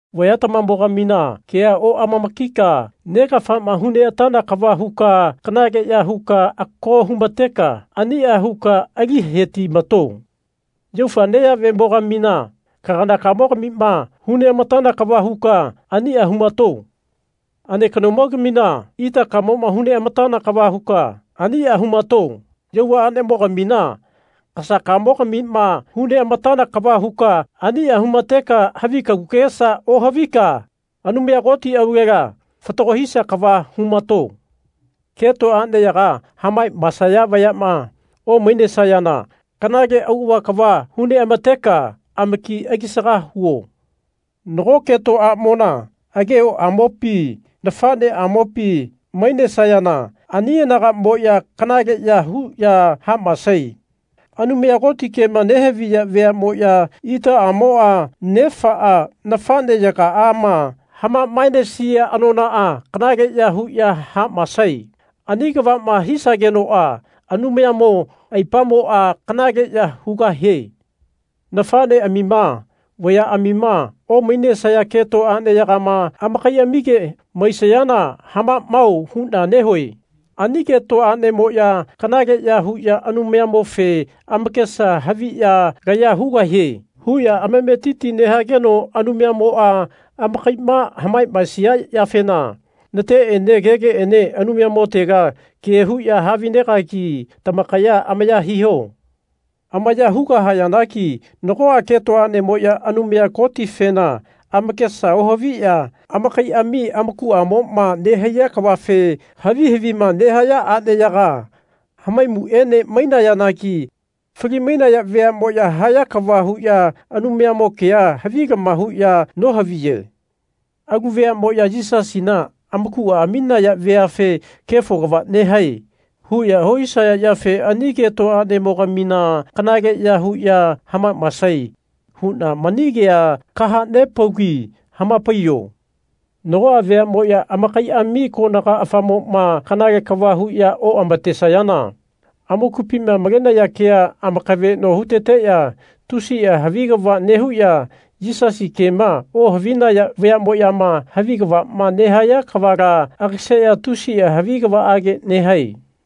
Vayatamamo-gamina kea oamamakika negafama huneatana kava huka kanaleya huka ako humateka ania huka ali hetimato. Yaufa neyavemo-gamina kaganakamo-gamima hu neamatana kava huka ania humato. Alekanomo-gamina itakamoma hu neatana kava huka ania humato. Yauva anemogamina kasakamo-gamima hu neamatana kava huka ania humateka havi kagu kagesa ohavika Anumaya Koti aulela fatago hisia kava humato. Keto aneyaga hamamaesaya vayama omainesayana kanale auava kava hu neamateka amaki alisaga huo. Nago keto amona agehoamopi nafaneamopi mainesayana ani anagamoya kanaleya huya hamaesae. Anumaya Koti kema nehaviya veamoya itaamoa nefaa nafaneyagaama hamamaenesia anonaa kanaleya huya hamaesae. Ani kavama hisagenoa Anumayamo aipamoa kanaleya hugahie. Nafaneamima vayaamima omainesia keto aneyagama amakaiamige maisayana hamamao huna nehue. Ani keto anemoya kanaleya huya Anumayamofe amakesa haviya Laya hugahie. huya amametiti nehageno Anumayamoa amakaima hamamaesia yafena nateene kegeene Anumayamotega ke huya havinegagi tamakaya amaya hiho. Amaya hugahayanagi nagoa keto anemoya Anumaya Kotifena amakesa ohaviya amakaiami amakuamoma nehaiya kavafe havi havima nehaya aneyaga hamaimuene mainayanagi fali-mainaya veamoya haya kava huya Anumayamo kea havilama huya nohaviye. Alu veamoya Yisasina amakua aminaya veafe Kefo kava nehae. huya ohisaya yafe ani keto anemo-gamina kanaleya huya hamamaesae huna mani kea kahanepaugi hamapaiyo. Nagoa veamoya amakaiami konaga afamoma kanale kava huya oamatesayana amakupima malenaya kea amakaveno huteteya tusia havi kava nehuya Yisasi kema ohavinaya vayamoyama havi kavama nehaya kavala agaseya tusia havi kavaage nehae.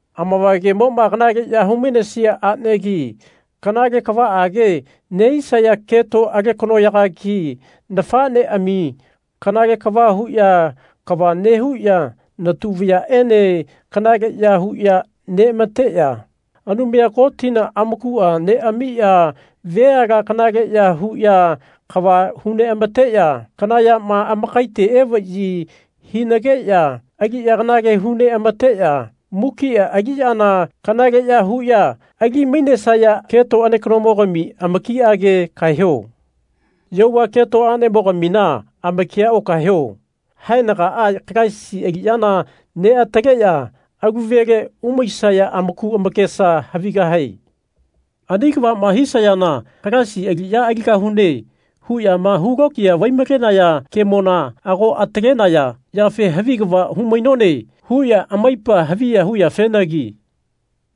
Amavagemoma kanaleyama humainesia anegi, kanale kavaage nehisaya keto alekanoyagagi, nafaneami kanale kava huya kava nehuya natu vayaene kanaleya huya neamateya, Anumaya Kotina amakua neamiya veala kanaleya huya kava hu neamateya, kana yama amakaite evayi hinageya aliya kanale hu neamateya, mukia aliyana kanaleya huya ali-mainesaya keto alekanomo-gami amakiage kaeho. Yauva keto anemogamina amakia okaeho. Haenagaa Kalaisi aliyana neataleya alu vele umaisaya amaku amakesa havigahae. Ani kavama hisayana Kalaisi aliya aligahune. huyama hulokiya vai-malenaya kemona ago atalenaya yafe Havi kava humainone. huya amaipa haviya huyafenagi.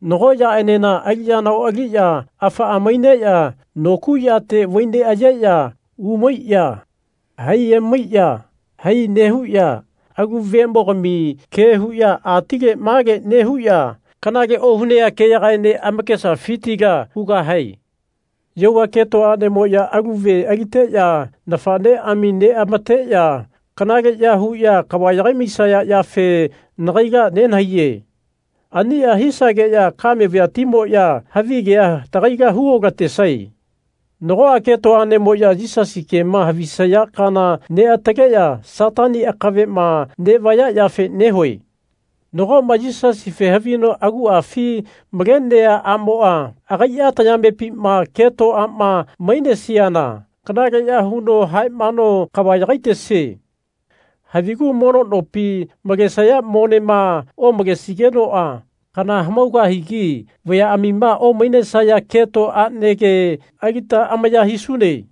Nago yaenena aliyana oaliya afaa maineya nokuyate vaineayeya umaiya-hai emaiya-hai nehuya alu veamogami ke huya atile male nehuya kanale ohunea keyagaene amakesafitila hugahae. Yauva keto anemoya alu ve aliteya nafaneami neamateya kanaleya huya kava yagai-maisaya yafe nagaila nenahaiye. Ania hisageya kame vayatimoya havigea tagaila hu otatesae. Nagoa keto anemoya Yisasi kema havisaya kaana neataleya Satani akavema nevaya yafe nehue. Nagoma Yisasife havino aguafi malenea amoa agaia tayamepima keto ama mainesiana kanaleya huno hamaeno kava yagaitesie. Havigu mono nopi malesaya monema omalesigenoa kana hamaugahigi vayaamima omainesaya keto anege alita amaya hisune.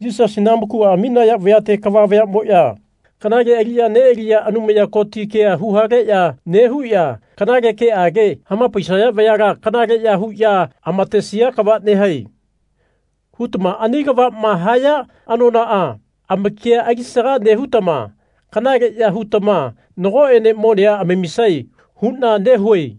Yisasina amakua aminaya vayate kava vayamoya kanale aliya nealiya Anumaya Koti ke huhaleya nehuya kanale keage hamapaisaya vayala Kanaleya huya amatesia kava nehae. hutama ani kavama haya anonaa amakia alisaga nehutama kanaleya hutama nagoene monea amamisae huna nehue.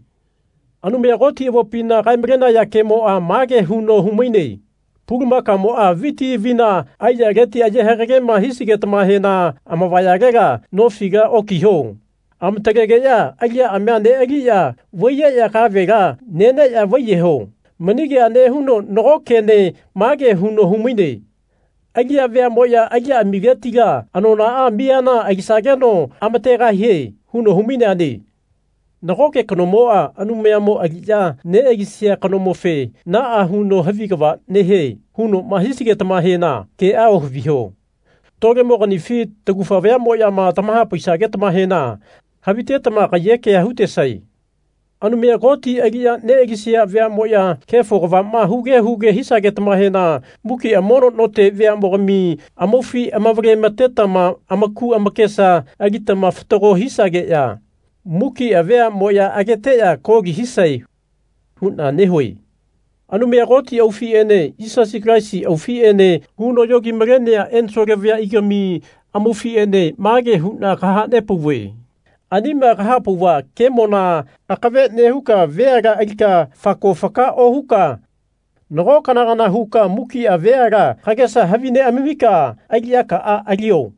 Anumaya Koti avopima kaemalenaya kemoa mage huno humaine Pulumakamoa viti avina aiyaleti aye hagagema hisigetamahena amavayalela nofila okiho. Amatalegeya aliyaamia nealiya vaiyeya kavela neneya vaiyeho. Mani kea nehuno nago kene mage huno humaine Aliya veamoya aliyaamiletila anonaa miyana alisageno amategahie. huno humaineane. Nagoke kanomoa Anumayamo aliya nealisia kanomofe Naa huno havi kava nehie. hunoma hisigetamahena kea ohaviho. Tolemoganifi tagufa vayamoyama tamahapaisagetamahena havitetama kaiyekea hutesae. Anumaya Koti aliya nealisaya veamoya kefo kavama huge huge hisagetama mukia mono note veamogami amaufi amavale-matetama amaku amakesa alitama fatago hisageya mukia veamoya ageteya koli hisae huna nehue. Anumaya Koti aufiene Yisasi Kalaisi aufiene huno yogi-malenea ensole vayaigami amaufiene mage huna kahanepauve Anima kahapauva kemona akave nehuka veala alika fako faka ohuka nago kana kana huka mukia veala kagesa havi neamamika aliyakaa alio.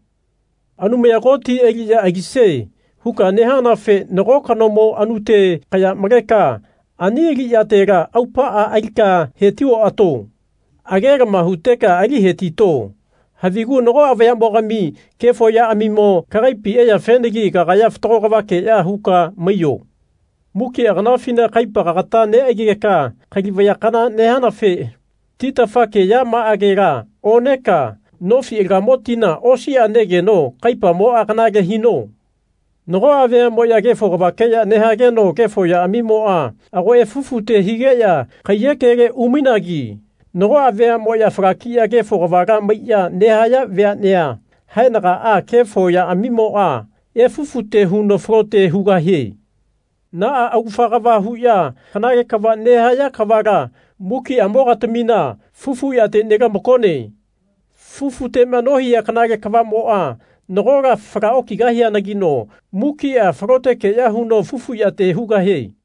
Anumaya Koti aliya alisie. huka nehanafe nago kanomo anute kaya maleka ani aliyatela aupaa alika heti oato. Agelama huteka ali hetito. Havigu nagoa vayamogami kefo yaamimo kagaipi eyafenagi kagaya fatago kavakeya huka maiyo. Mukia kanafina kaipa kagata neaigeka kali vaya kana nehanafe titafakeyamaagela oneka nofi alagamo tina osia negeno kaipamoa kanale hino. Nagoa veamoya kefo kavakeya nehageno kefo yaamimoa ago efufute higeya kaiyekele umainagi nagoa veamoya falakiya kefo kavala maiya nehaya veanea haenagaa kefo yaamimoa efufute huno falote hugahie. Naa augafa kava huya kanale kava nehaya kavala mukiamogatamina fufu yate nelamakone. Fufutema nohia kanale kavamoa nagola fala okigahianagino mukia falotekeya huno fufu yate hugahie.